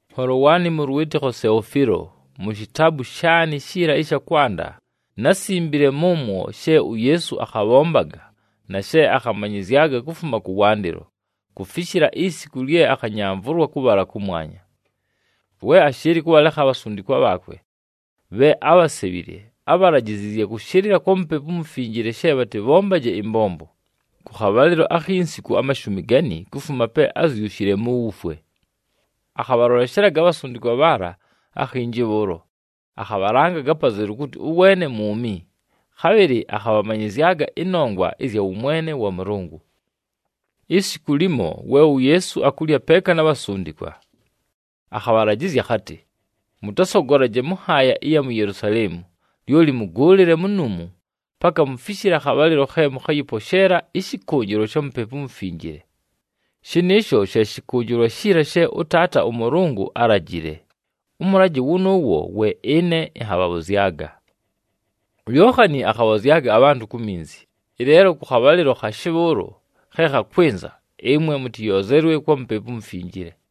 Nholo waanɨ mʉ lwɨtɨkho Seofiilo, mu shitaabu shaanɨ shiila ɨsha kwanda, násimbile mʉmwo she uYeesu akhabhombaga, na she akhamanyɨzyaga, kufuma kʉwandɨlo kufishila isiku lye akhanyamvʉlwa kʉbhala kʉmwanya. We ashɨɨlɨ kʉbhalekha abhasundikwa bhaakwe bhe ábhasebhile, ábhalajiziizye kʉshɨlɨla kwa Mupepu uMufinjile she bhatɨbhombaje ɨmbombo. Kʉ khabhalɨlo akhi nsiku amashumi gani kufuma pe ázyushile mu wufwe, akhabhaloleshelaga abhasundikwa bhaala akhinji bhʉʉlo, akhabhalangaga apazelu kʉtɨ ʉweene mwumi. Khabhɨlɨ akhabhamanyɨzyaga ɨnongwa ɨzya wʉmwene wa Mʉlʉngʉ. Isiku limo, we uYeesu akulya peeka na bhasundikwa, akhabhalajɨzya akhatɨ, “Mʉtasogolaje mʉ nhaaya ɨya mu Yelusaleemu, lyoli mʉgʉʉlɨle munuumu, paka mufishile akhabhalɨlo khe mʉkhayɨposheela ɨshɨkʉnjɨlwa sha Mupepu uMufinjile. Shɨnɨɨsho she shɨkʉnjɨlwa shiila she ʉTaata ʉMʉlʉngʉ álajile, ʉmʉlajɨ wʉnʉʉwo we ɨne ɨnhabhabhʉzyaga. UYookhani akhabhozyaga abhantʉ ku minzi, ɨleelo kʉ khabhalɨlo khashe bhʉʉlo khe khakwɨnza, ɨmwe mʉtɨyoozelwe kwa Mupepu uMufinjile.”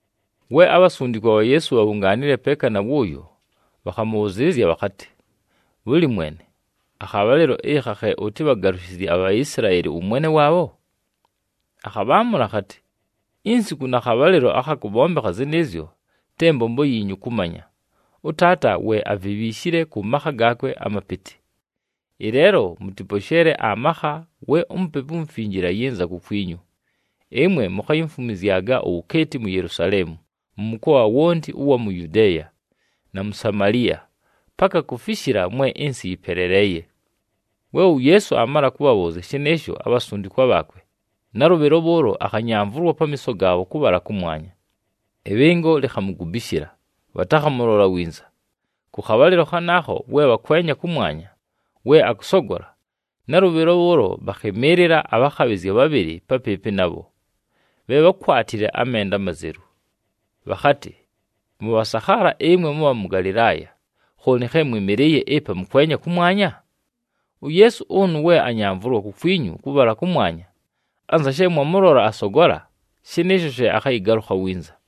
We abhasundikwa bha Yeesu bhabhungaanile peeka na wʉʉyo, bhakhamʉbhʉzɨɨlɨzya bhakhatɨ, “Bhʉlɨ, Mwene, akhabhalɨlo ɨkha khe ʉtɨbhagalʉshɨzye aBhaisilaeli ʉwʉmwene waabho?” Akhabhaamʉla akhatɨ, “Insiku na khabhalɨlo akha kʉbhombekha zɨnɨɨzyo, te mbombo yiinyu kʉmanya. ɄTaata we avibhiishile kʉ makha gaakwe amapɨtɨ. Ɨleelo mʉtɨposheele amakha we uMupepu uMufinjile ayɨnza kukwinyu, ɨmwe mukhayimfumwizyaga uwukeeti mu Yelusaleemu, mʉ mʉkoa wonti ʉwa mu Yudeeya, na mu Samaliya, paka kufishila mwe ɨnsɨ yɨpeleleeye.” We uYeesu aamala kʉbhabhʉʉzya shɨnɨɨsho abhasundikwa bhaakwe, nalʉbhɨlo bhʉʉlo akhanyamvʉlwa pamiiso gaabho kʉbhala kʉmwanya. Ɨbhɨngo likhamugubishila, bhatakhamʉlola winza. Kʉ khabhalɨlo khanaakho we bhakwenya kʉmwanya we akʉsogola, nalʉbhɨlo bhʉʉlo bhakhɨmɨɨlɨla abhakhabhɨzya bhabhɨlɨ papɨɨpɨ nabho, bhe bhákwatile amenda amazelu. Bhakhatɨ, “Mʉbhasakhaala ɨmwe mʉbha mʉ Galɨlaaya, khooni khe mwɨmɨlɨɨye ɨpa mʉkwenya kʉmwanya? UYeesu ʉnʉ we anyamvʉlwa kukwinyu kʉbhala kʉmwanya, anza she mwamʉlola asogola, shɨnɨɨsho she akhayɨgalʉkha winza.”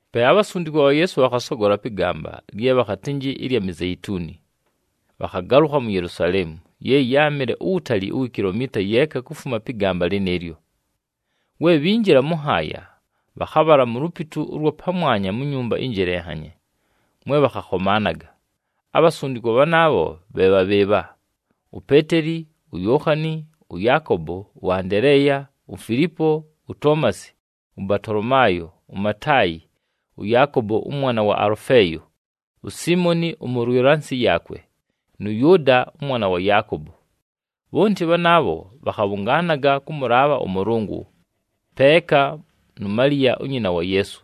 Pe abhasundikwa bha Yeesu bhakhasogola pɨ gamba lye bhakhatɨnjɨ ɨlya Mizeituni, bhakhagalʉkha mu Yelusaleemu, ye yáamɨle uwutali uwi kilomiita yeeka kufuma pɨ gamba lɨnɨɨlyo. We bhinjila mʉ nhaaya, bhakhabhala mu lupitu ʉlwa pamwanya mu nyumba ɨnjelenhanye, mwe bhakhakhomaanaga. Abhasundikwa bhanaabho bhe bha bhɨɨbha: uPeeteli, uYookhani, ʉYaakobo, ʉAndeleeya, uFilipo, uToomasi, ʉBatolomaayo, uMataayi, ʉYaakobo ʉmwana wa Alʉfeeyo, uSiimoni ʉmʉlwɨla nsɨ yaakwe, nʉ Yʉʉda ʉmwana wa Yaakobo. Bhonti bhanaabho bhakhabhʉngaanaga kʉmʉlaabha ʉMʉlʉngʉ, peeka nu Maliya unyina wa Yeesu,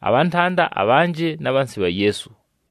abhantanda abhanjɨ, na bhansi bha Yeesu.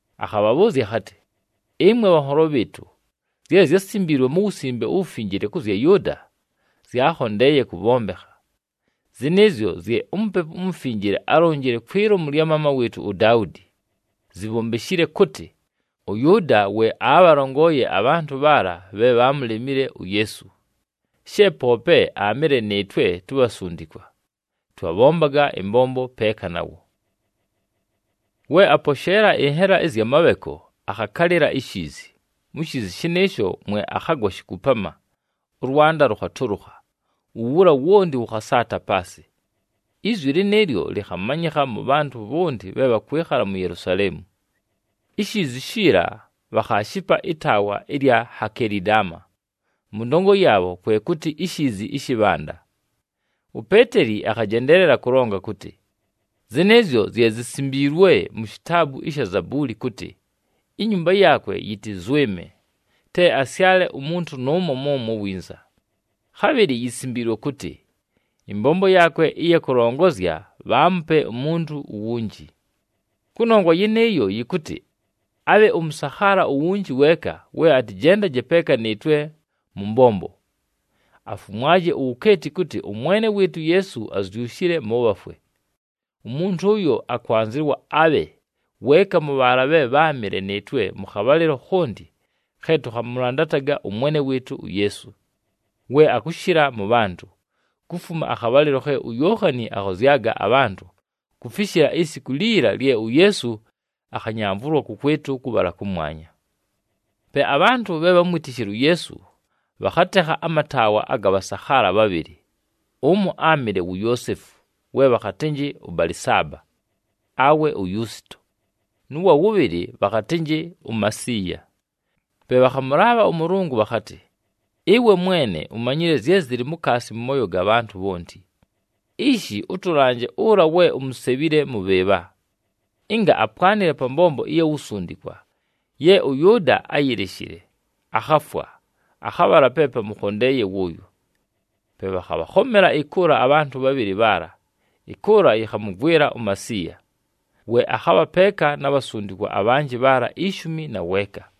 akhabhabhʉʉzya akhatɨ, “Ɨmwe bhanholo bhɨɨtʉ, zye zyásimbiilwe mu Wusimbe uWufinjile kʉ zya Yʉʉda, zyaakhondeeye kʉbhombekha. Zɨnɨɨzyo zye uMupepu uMufinjile álonjile kwi lomu lya maama wɨɨtʉ uDaudi zibhombeshile kʉtɨ, ʉYʉʉda we aabhalongooye abhantʉ bhaala bhe bhaamulemile uYeesu, she poope aamɨle nɨɨtwe tubhasundikwa, twabhombaga ɨmbombo peeka nawo.” We aposheela ɨnhela ɨzya mabheko, akhakalɨla ishiizi. Mu shiizi shɨnɨɨsho mwe akhagwa shikupama, ʉlwanda lʉkhatʉlʉkha, uwula wonti wʉkhasaata paasɨ. Izwi lɨnɨɨlyo lɨkhamanyɨkha mʉ bhantʉ bhonti bhe bhakwɨkhala mu Yelusaleemu. Ishiizi shiila bhakhaashipa ɨtaawa ɨlya Hakelidama mʉ ndongo yaabho kwe kʉtɨ, iShiizi ɨshɨ Bhanda. UPeeteli akhajendeelela kʉlonga kʉtɨ, “Zɨnɨɨzyo zye zisimbiilwe mu shitaabu ɨsha Zabuuli kʉtɨ, ‘Inyumba yaakwe yɨtɨzwɨme, te asyale umuntu nʉʉmo mʉmwo winza.’ Khabhɨlɨ yisimbiilwe kʉtɨ, ‘Ɨmbombo yaakwe ɨya kʉlongozya bhaamupe umuntu uwunji.’ Kʉnongwa yɨnɨɨyo, yɨkʉtɨ abhe ʉmʉsakhaala uwunji weeka we atɨjendaje peeka nɨɨtwe mʉ mbombo, afumwaje uwukeeti kʉtɨ ʉMwene wɨɨtʉ uYeesu azyushile mʉ bhafwe. Umuntu ʉyo, akwanzɨwa abhe weeka mʉ bhaala bhe bháamɨle nɨɨtwe mʉ khabhalɨlo khonti khe tʉkhamʉlandataga ʉMwene wɨɨtʉ uYeesu, we akʉshɨla mʉ bhantʉ, kufuma akhabhalɨlo khe uYookhani akhozyaga abhantʉ, kufishila isiku liila lye uYeesu akhanyamvʉlwa kʉkwɨtʉ kʉbhala kʉmwanya.” Pe abhantʉ bhe bhámwitishile uYeesu, bhakhatekha amataawa aga bhasakhaala bhabhɨlɨ. Ʉmo áamɨle wu Yoosefu we bhakhatɨnjɨ ʉBalɨsaaba, awe uYusito, nʉ wa wʉbhɨlɨ, bhakhatɨnjɨ uMasiiya. Pe bhakhamʉlaabha ʉMʉlʉngʉ bhakhatɨ, “Ɨwe Mwene, umanyile zye zɨlɨ mukaasi mʉ mooyo ga bhantʉ bhonti. Ishi, ʉtʉlanje ʉla we umusebhile mʉ bhɨɨbha, ɨnga apwanɨle pa mbombo ɨya wusundikwa ye ʉYʉʉda áyileshile, akhafwa, akhabhala pe pamʉkhondeeye wʉʉyo.” Pe bhakhabhakhomela ɨkʉʉla abhantʉ bhabhɨlɨ bhaala, ɨkʉʉla yɨkhamʉgwɨla uMasiiya, we akhabha peeka na bhasundikwa abhanjɨ bhaala ishumi na weeka.